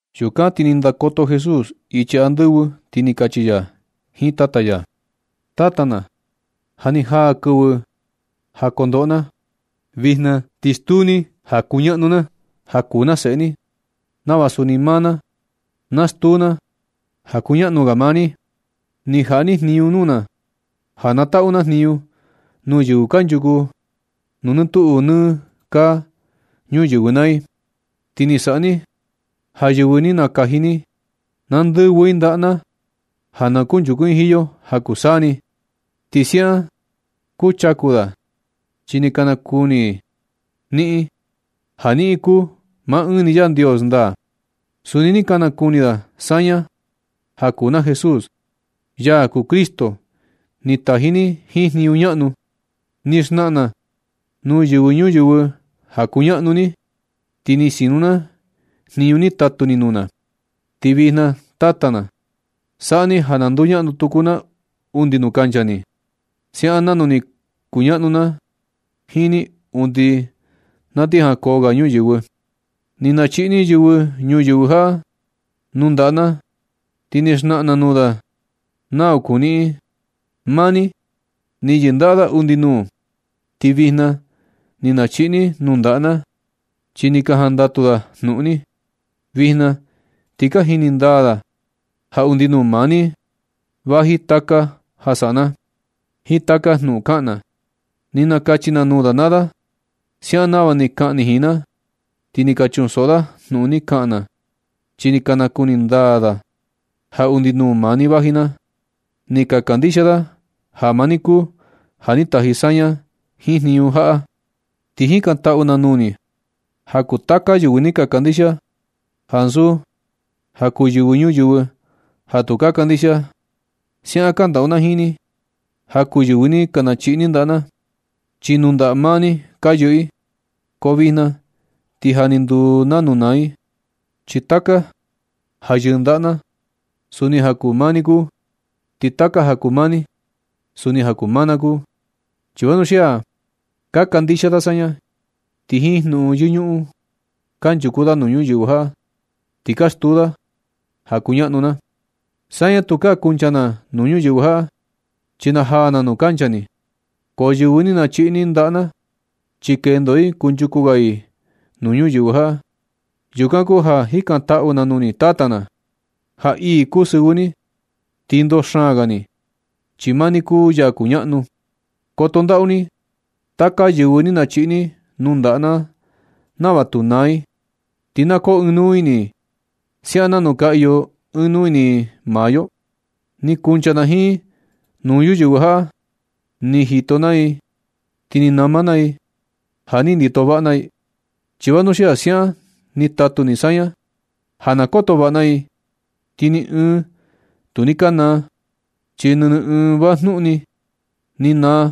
Yukan ti ni ndakoto Jesús ichi andɨvɨ ti ni kachi ya jiin Tata ya: ―Tata na, ja ni jaa kɨvɨ ja kondoꞌo na. Vijna ti stuu ni ja kuñaꞌnu na, ja kuu na seꞌe ni, nava suni maa na na stuu na ja kuñaꞌnu ga maa ni. Ni jaꞌa ni jniñu nuu na ja na taꞌu na jniñu nuu yɨvɨ kanchuku nuu nɨ tuꞌu nɨ kaa nuyɨvɨ naa i. Ti ni saꞌa ni ja yɨvɨ ni nakaji ni, na ndɨvɨ i ndaꞌa na, ja na kuchaku i jiin yo ja kuu saa ni. Ti siaꞌan kuchaku da chi ni ka nakuni i niꞌin, ja niꞌin kuu maa ɨɨn ni Yandios ndaa. Suni ni ka nakuni da saña ja kuu na Jesús, ya kuu Cristo ni taji ni jiin jniñu ñaꞌnu. Ni xnaꞌan na nuu yɨvɨ ñuyɨvɨ ja kuñaꞌnu ni, ti ni sinu na jniñu ni tatu ni nuu na. Ti vijna, Tata na, saꞌa ni ja na nduñaꞌnu tuku na undi nuu kancha ni, siaꞌan nanu ni kuñaꞌnu na jiin ni undi na ti jankoo ga ñuyɨvɨ. Ni nachiꞌi ni yɨvɨ ñuyɨvɨ jaꞌa nuu ndaꞌa na, ti ni xnaꞌan na nuu da nau kuu niꞌin. Maa ni ni yɨndaꞌa da undi nuu, ti vijna ni nachiꞌi ni i nuu ndaꞌa na, chi ni ka jandatu da jnuꞌun ni. Vijna ti ka jini ndaa da ja undi nuu maa ni vaji taka ja saꞌa na, jiin taka jnuꞌun kaꞌan na. Ni nakachi na nuu da naa da, siaꞌan nava ni kaꞌan ni jiin na. Ti ni ka chunsoꞌo da jnuꞌun ni kaꞌan na, chi ni ka nakuni ndaa da ja undi nuu maa ni vaji na, ti ka kandixia da ja maa ni kuu ja ni taji saña jiin jniñu jaꞌa. Ti jikantaꞌu na nuu ni ja kuu taka yɨvɨ ni ka kandixia, ansu ja kuu yɨvɨ ñuyɨvɨ ja tu ka kandixia. Siaꞌan kandaꞌu na jiin ni ja kuu yɨvɨ ni nachiꞌi ni ndaꞌa na, chi nuu ndaꞌa maa ni ni ka yɨꞌɨ i, ko vijna ti ja ni nduu nanu na i. Chi taka ja yɨꞌɨ ndaꞌa na, suni ja kuu maa ni kuu. Ti taka ja kuu maa ni, suni ja kuu maa na kuu. Chi vanuxia ka kandixia da saña, ti jiin jnuꞌun yɨñuꞌun kanchuku da nuu ñuyɨvɨ jaꞌa ti ka stuu da ja kuñaꞌnu na. Saña, tukaa kuncha na nuu ñuyɨvɨ jaꞌa, chi na jaa na nuu kancha ni. Ko yɨvɨ ni nachiꞌi ni ndaꞌa na, chi kendo i kunchuku ga i nuu ñuyɨvɨ jaꞌa. Yukan kuu ja jikantaꞌu na nuu ni Tata na, ja ii kuu sɨvɨ ni ti ndoo xaan ga ni, chi maa ni kuu ya kuñaꞌnu. Koto ndaꞌu ni taka yɨvɨ ni nachiꞌi ni nuu ndaꞌa na nava tu naa i, ti na koo ɨɨn nuu ini i siaꞌan nanu ka iyo ɨɨn nuu ini maa yo. Ni kuncha na jiin i nuu ñuyɨvɨ jaꞌa. Ni jito naa i ti ni na maa i ja ni ndito vaꞌa na i, chi vanuxia siaꞌan ni tatu ni saña ja na koto vaꞌa na i. Ti ni ɨɨn tu ni ka naa, chi nɨnɨ ɨɨn vajnuꞌun ni da ni naa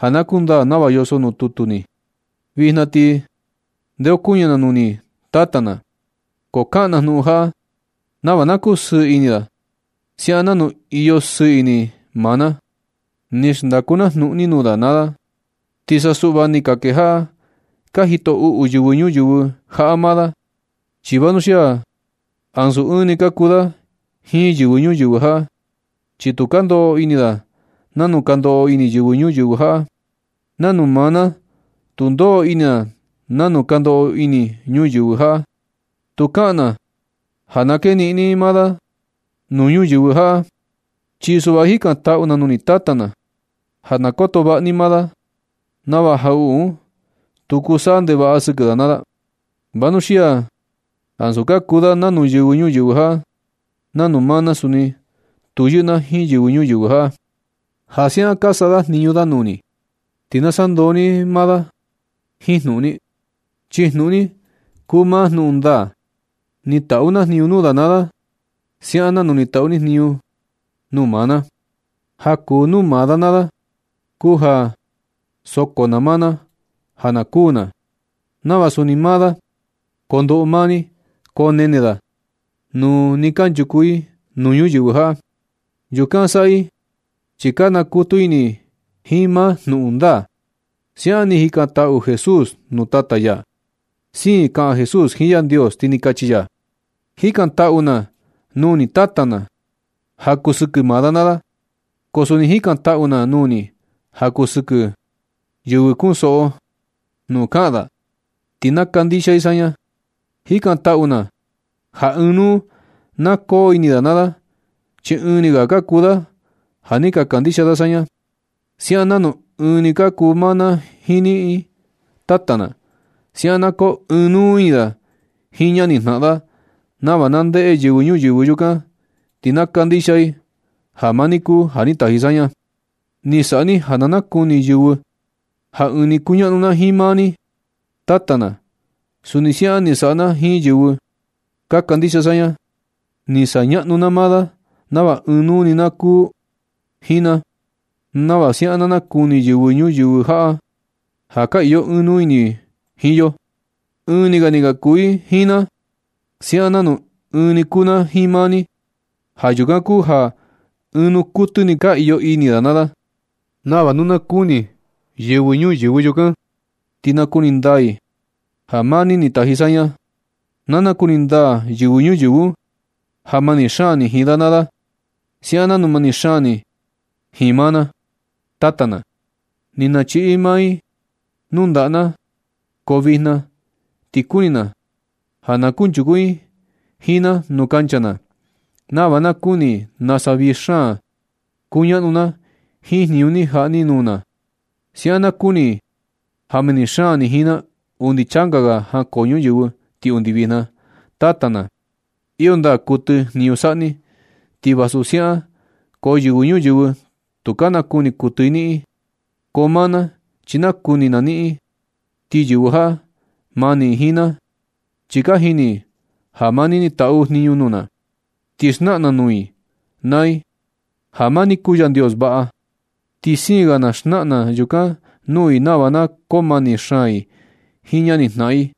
ja na kundaa nava yoso nuu tutu ni. Vijna ti ndeokuñɨ na nuu ni Tata na, ko kaꞌan na jnuꞌun jaꞌa nava na kusɨɨ ini da siaꞌan nanu iyo sɨɨ ini maa na. Ni xndaku na jnuꞌun ni nuu da naa da. Ti sa suꞌva ni ka kejaꞌa ka jito uꞌu yɨvɨ ñuyɨvɨ jaꞌa maa da. Chi vanuxia ansu ɨɨn ni ka kuu da jiin yɨvɨ ñuyɨvɨ jaꞌa. Chi tu ka ndoꞌo ini da nanu ka ndoꞌo ini yɨvɨ ñuyɨvɨ jaꞌa, nanu maa na tu ndoꞌo ini na nanu ka ndoꞌo ini yɨvɨ ñuyɨvɨ jaꞌa. Tu kaꞌan na ja na keniꞌin ni maa da naa sa nuu ñuyɨvɨ jaꞌa. Chi suꞌva jikantaꞌu na nuu ni Tata na, ja na koto vaꞌa ni maa da, nava jaꞌuꞌu un tu kuu saꞌa ndevaꞌa sɨkɨ da naa da. Vanuxia ansu ka kuu da nanu yɨvɨ ñuyɨvɨ jaꞌa, nanu maa na suni tu yɨꞌɨ na jiin yɨvɨ ñuyɨvɨ jaꞌa. Ja siaꞌan ka saꞌa jniñu da nuu ni, ti na sandoo ni maa da jiin jnuꞌun ni. Chi jnuꞌun ni kuu maa jnuꞌun ndaa. Ni taꞌu na jniñu nuu da naa da, siaꞌan nanu ni taꞌu ni jniñu nuu maa na. Ja kuu nuu maa da naa da kuu ja soko na maa na ja na kuū na, nava suni maa da kondoꞌo maa ni konene da nuu nɨ kanchuku i nuu ini ñuyɨvɨ jaꞌa. Yukan saꞌa i chi ka nakutu ini i jiin maa jnuꞌun ndaa ―siaꞌan ni jikantaꞌu Jesús nuu Tata ya. Siin kaꞌan Jesús jiin Yandios, ti ni kachi ya: ―Jikantaꞌu na nuu ni Tata na, ja kuu sɨkɨ maa da naa da, ko suni jikantaꞌu na nuu ni ja kuu sɨkɨ yɨvɨ kunsoꞌo jnuꞌun ka kaꞌan da, ti na kandixia i saña. Jikantaꞌu na ja ɨɨn nuu na koo ini da naa da chi ɨɨn ni ga ka kuu da ja ni ka kandixia da saña, siaꞌan nanu ɨɨn ni kuu maa na jiin niꞌin. Tata na. Siaꞌan na koo ɨɨn nuu ini da jiin ñanijnaꞌan da nava na ndeꞌe yɨvɨ ñuyɨvɨ yukan, ti na kandixia i ja maa ni kuu ja ni taji saña. Ni saꞌa ni ja na nakuni yɨvɨ ja ɨɨn ni kuñaꞌnu na jiin maa ni, Tata na. Suni siaꞌan ni saꞌa na jiin yɨvɨ ka kandixia saña. Ni sañaꞌnu na maa da naa da nava ɨɨn nuu ni ka kuu i jiin na, nava siaꞌan na nakuni yɨvɨ ñuyɨvɨ ja ka iyo ɨɨn nuu ini i jiin yo. Ɨɨn ni ga ni ka kuu i jiin na, siaꞌan nanu ɨɨn ni kuu na jiin maa ni. Ja yukan kuu ja ɨɨn nuu kuɨtɨ ka iyo ini da naa da, nava nu na kuni yɨvɨ ñuyɨvɨ yukan, ti nakuni ndaa i ja maa ni ni taji saña. Na nakuni ndaa yɨvɨ ñuyɨvɨ un ja mani xaan ni jiin da naa da, siaꞌan nanu mani xaan ni jiin maa na. Tata na, ni nachiꞌi ni maa i nuu ndaꞌa na naa i, ko vijna ti kuni na ja na kunchuku i jiin na nuu kuncha na, nava na kuni i nasa vii xaan kuñaꞌna na jiin jniñu ni jaꞌa ni nuu na. Siaꞌan na kuni i ja mani xaan ni jiin na undi changa ga jankoo ñuyɨvɨ ti undi vijna. Tata na, iyo ndaa kuɨtɨ jniñu saꞌa ni. Ti vasu siaꞌan, ko yɨvɨ ñuyɨvɨ, tu ka nakuni kuɨtɨ i niꞌin. Ko maa na, chi nakuni na niꞌin. Ti yɨvɨ jaꞌa, mani i jiin na, chi ka jini i ja maa ni ni tatu jniñu nuu na. Ni xnaꞌan na nuu i naa i da ja maa ni kuu Yandios vaꞌa. Ti siin ga na xnaꞌan na yukan nuu i nava na koo mani xaan i jiin ñanijnaꞌan i,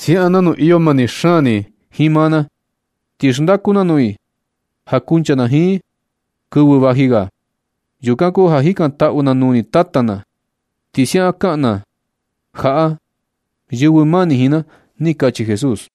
siaꞌan nanu iyo mani xaan ni jiin maa na. Ti xndaku na nuu i ja kuncha na jiin i kɨvɨ vaji ga. Yukan kuu ja jikantaꞌu na nuu ni, Tata na, ti siaꞌan kaꞌan na jaꞌa yɨvɨ mani jiin na ―ni kachi Jesús.